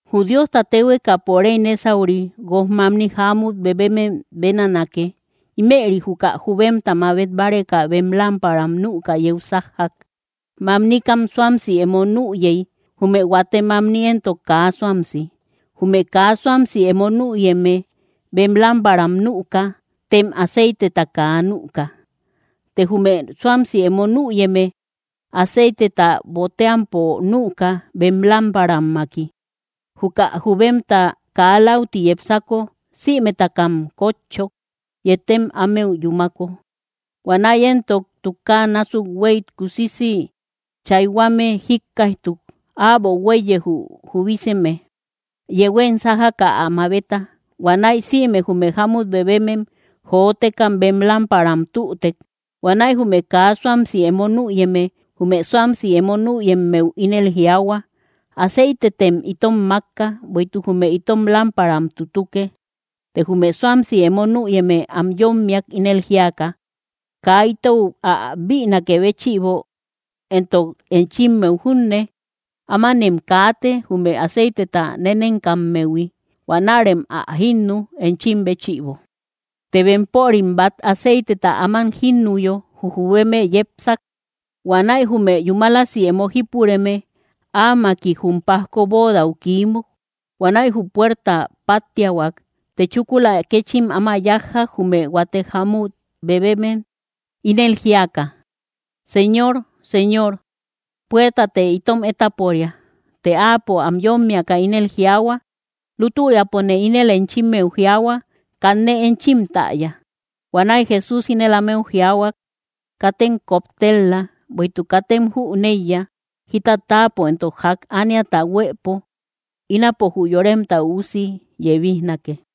’Jü Diosta téhuekapo réy nésauri guojmamni jámut bebemem bénanake. Ímëri juka jubemta mabet báreka bem lámparam nüka yeu sájjak. Mamnikam suamsi emo nüyey; jume huate mamni éntok kaa suamsi. Jume kaa suamsi emo nüyeme bem lámparam nüka, tem aceiteta kaa nüka. Të jume suamsi emo nüyeme, aceiteta boteampo nüka, bem lámparammaki. Juka jubemta kaa läuti yepsako, sïmetakam kótchok, yetem ámeu yúmako. Huanäi éntok tukaa násuk huéy kusisi chayhuame jíkkaijtuk: “¡Äbo huéiye, jü jubiseme! ¡Yehuem sájaka ä mabeta!” Huanäi sïme jume jámut bebemem, jotekam bem lámparam tütek. Huanäi jume kaa suamsi emo nüyeme, jume suamsi emo nüyemmeu ínel jiaahua: “Aceitetem itom mákka; bueïtuk jume itom lámparam tutuke.” Te jume suamsi emo nüyeme am yómmiak, ínel jíaka: “Kaa itou ä bïnakë béchïbo, entok enchimmeu junne, ámanem kaate, jume aceiteta nenenkammehui. Huanärem ä jínnu, enchim béchïbo.” Të bempörim bát aceiteta áman jínnuyo, jü jubeme yepsak. Huanäi jume yúmalasi emo jípureme, áamaki jum pajko bóodau kiímuk. Huanäi jü puerta páttiahuak. Të chúkula kéchim áma yájjak, jume huate jámut bebemem, ínel jíaka: “¡Señor, señor! ¡Puertatë itom étaporia!” Të áapo am yómmiaka ínel jiaahua: “Lútüriapone ínel enchimmeu jiaahua, kanne enchim täya.” Huanäi Jesús ínel ámeu jiaahuak: —Katem koptel‑la, bueïtuk katem jüneïya jita táapo entok ják ániata huëpo, ínapo jü Yoremta Üusi yebijnake.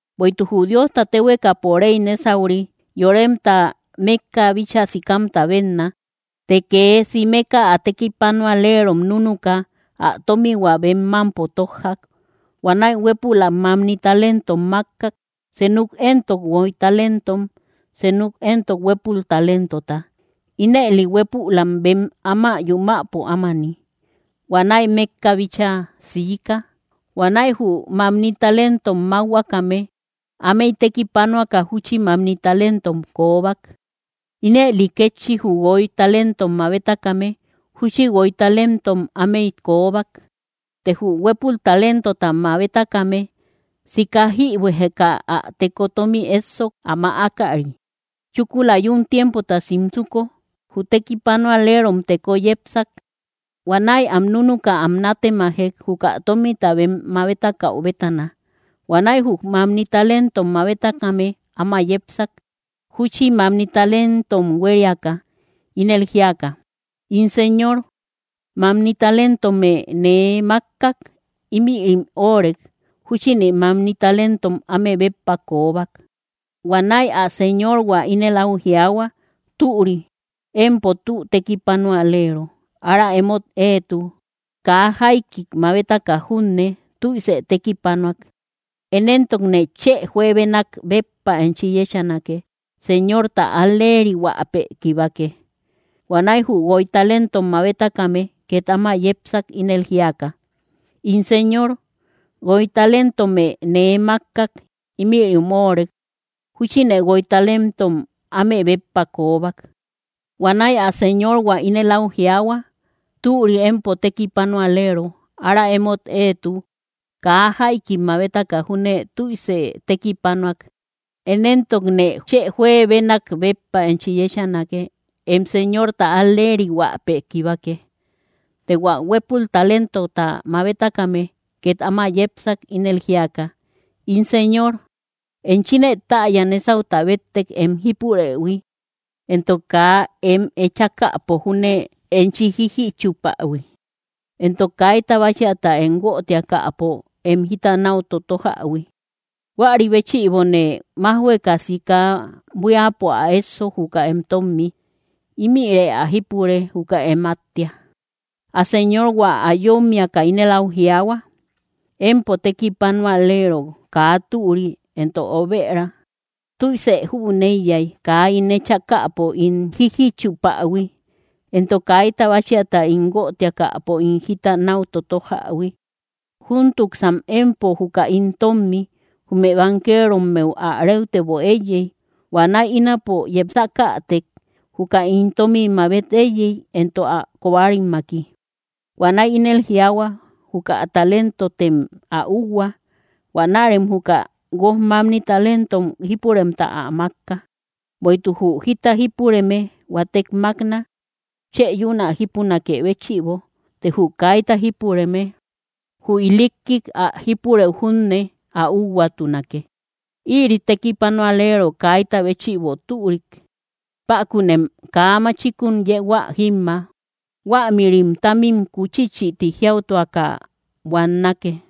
’Bueïtuk jü Diosta téhuekapo réy nésauri, yoremta mékka bíchaa sikamta bénna. Të kee simeka ä tekipanualerom núnuka, ä tómihua bem mámpo tójjak. ’Huanäi huépülak mamni talentom mákkak, senuk éntok guoy talentom, senuk éntok huépul talentota, ínëli hueepulam bem áma yumäpo ámani. Huanäi mékka bíchaa siika. Huanäi jü mamni talentom mákhuakame, ámey tekipanuaka júchi mamni talentom koobak. Ínëli kétchi jü guoy talentom mabetakame, júchi guoy talentom ámey koobak. Të jü huépul talentota mabetakame, sika jïbuejeka ä teko tómi éssok, ä mäakari. ’Chúkula yún tiempota simsuko, jü tekipanualerom teko yepsak. Huanäi am núnuka am nátemajek, juka tómita bem mabetakäu bétana. Huanäi jü mamni talentom mabetakame áma yepsak, júchi mamni talentom huériaka, ínel jíaka: “In Señor, mamni talentomë nee mákkak; ímïrim óorek; júchine mamni talentom áme béppa koobak.” Huanäi ä Señorhua ínel áu jiaahua: “Türi, empo tü tekipanualero ára emót eetu kaa jaikik mabetaka junne tüise tekipanuak. Én éntokne chë juebenak béppa enchi yéchanake. Señorta al‑lerihuäpë kibake.” Huanäi jü guoy talentom mabetakame két áma yepsak, ínel jíaka: “In Señor, guoy talentomë nee mákkak; ímïrim óorek; júchine guoy talentom áme béppa koobak.” Huanäi ä Señorhua ínel áu jiaahua: “Türi, empo tü tekipanualero ára emót eetu; kaa jaikik mabetaka junne tüise tekipanuak. Én éntokne chë juebenak béppa enchi yéchanake. Em Señorta al‑lerihuäpë kibake.” Të hua huépul talentota mabetakame két áma yepsak, ínel jíaka: “In Señor, enchine täya, nésauta béttek em jípurëhui, entok kaa em echakäpo júne enchi jíjichupähui, entok kaita báchiata em guötiakäpo em jita náu totojähui. Huäri béchïbone májhueka, sika buíapo ä éssok, juka em tómmi. Ímïre ä jípure, juka em áttia.” Ä Señorhua ä yómmiaka ínel áu jiaahua: “¡Empo tekipanualero kaa türi entok obëra! Tüise jüneiyay kaa ín echakäpo ín jíjichupähui, entok kaita báchiata ín guötiakäpo ín jita náu totojähui. Júntuksan empo juka ín tómmi, jume bankerommeu ä réutebo éiyey. Huanäi ínapo yepsakätek, juka ín tómi mabet éiyey, entok ä kobarimaki.” Huanäi ínel jiaahua: “Juka talentotem ä úuhua. Huanärem juka guojmamni talentom jípuremta ä mákka. Bueïtuk jü jita jípureme, huatek mákna, chë yún ä jípunakë béchïbo; të jü kaita jípureme, jü ilikkik ä jípurëu junne ä úuhuatunake. Ïri tekipanualero kaita béchïbo türik, pákunem kaa machikun yehuä jímma. Huämïrim támim kuchichïti jiautuaka buannake.”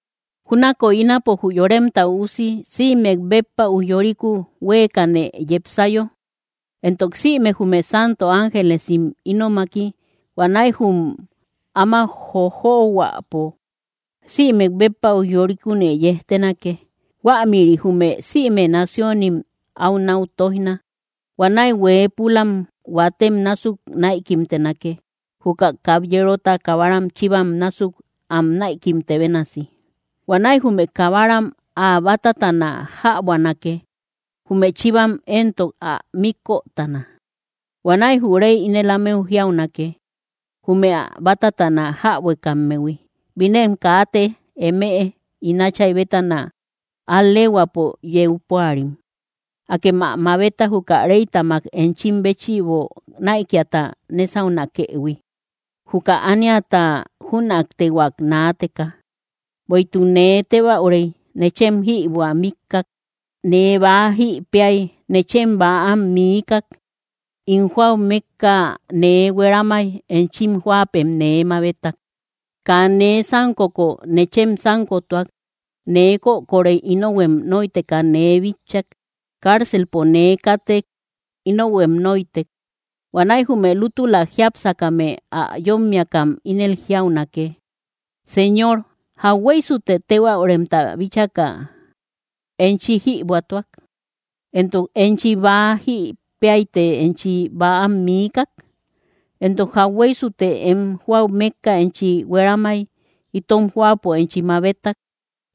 ’Júnakoy ínapo jü Yoremta Üusi sïmek béppa ujyoriku huéekane yepsayo, entok sïme jume santo ángelesim ínomaki, huanäi jum áma jojohuäpo sïmek béppa ujyorikune yejtenake. Huämïri jume sïme naciónim áu náu tóijna. Huanäi hueepulam huatem násuk näikimtenake, juka kabyerota kabaram chivam násuk am näikimte bénasi. Huanäi jume kabaram ä bátatana jäbuanake; jume chivam éntok ä míkötana. Huanäi jü réy ínel ámeu jiaunake, jume ä bátatana jäbuekammehui: “¡Binem kaate, emëe ín Átchay bétana al‑leehuäpo yeu púarim! Akem ä mabeta, juka réytamak enchim béchïbo näikiata nesaunakëhui, juka ániata jünaktehuak naateka. Bueïtuk nee tébäurey, nechem jïbuä miikak; nee bäa jï péay, nechem bäam miikak; ín jóau mékka nee hueramay, enchim jóapem nee mabetak; kaa nee sánkoko, nechem sánkotuak; nee kökorey, ínohuem nóiteka nee bitchak; cárcelpo nee kátek, ínohuem nóitek.” Huanäi jume lútula jiápsakame ä yómmiakam ínel jiaunake: “Señor, ¿jauhueysute tébäuremta bíchaka enchi jïbuätuak, entok enchi bäa jï péayte enchi bäam miikak? Entok, ¿jauhueysute em jóau mékka enchi hueramay, itom jóapo enchi mabetak,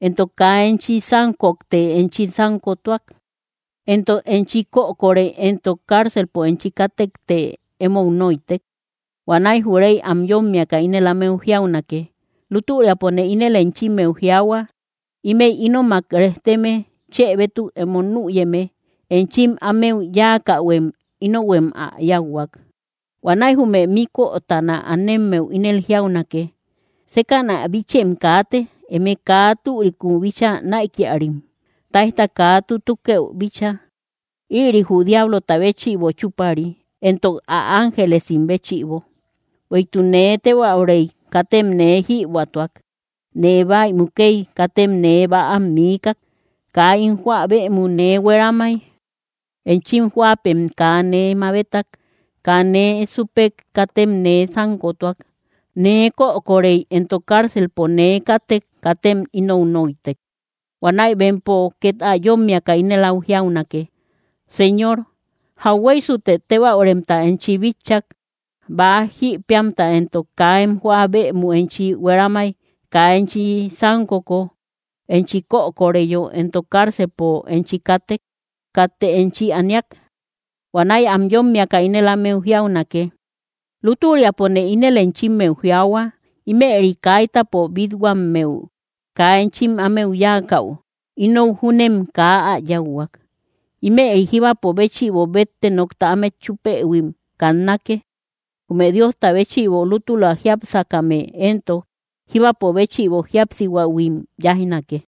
entok kaa enchi sánkokte enchi sánkotuak? Entok, ¿enchi kökorey entok cárcelpo enchi kátekte emou nóitek?” Huanäi jü réy am yómmiaka, ínel ámeu jiaunake: “Lútüriapone ínel enchimmeu jiaahua, ímëi ínomak rejteme chë bétuk emo nüyeme enchim ámeu yáakähuem, ínohuem ä yáuhuak.” ’Huanäi jume míkötana anemmeu ínel jiaunake: “Sékäna bichem kaate, eme kaa türikun bíchaa näikiarim, táijta kaa tutukëu bíchaa; ïri jü diablota béchïbo chúpari, entok ä ángelesim béchïbo. Bueïtuk nee tébäurey, katem nee jïbuätuak; nee bäi mukey, katem nee bäam miikak; kaa ín jóa bëmu nee hueramay, enchim jóapem kaa nee mabetak; kaa nee súpek, katem nee sánkotuak; nee kökorey, entok cárcelpo nee kátek, katem ínou nóitek.” Huanäi bempo két ä yómmiaka ínel áu jiaunake: “Señor, ¿jauhueysute tébäuremta enchi bitchak, bäa jï péamta, entok kaa em jóa bëmu enchi hueramay, kaa enchi sánkoko, enchi kökoreyo, entok cárcelpo enchi kátek, katte enchi aniak?” Huanäi am yómmiaka ínel ámeu jiaunake: “Lútüriapone ínel enchimmeu jiaahua, ímëri kaitapo bít-huammeu kaa enchim ámeu yáakäu, ínou júnem kaa ä yáuhuak.” Ímëri jíbapo béchïbo bétte nokta ámet chúpëhuim kannake; jume Diosta béchïbo lútula jiápsakame éntok, jíbapo béchïbo jíapsihuähuim yáijnake.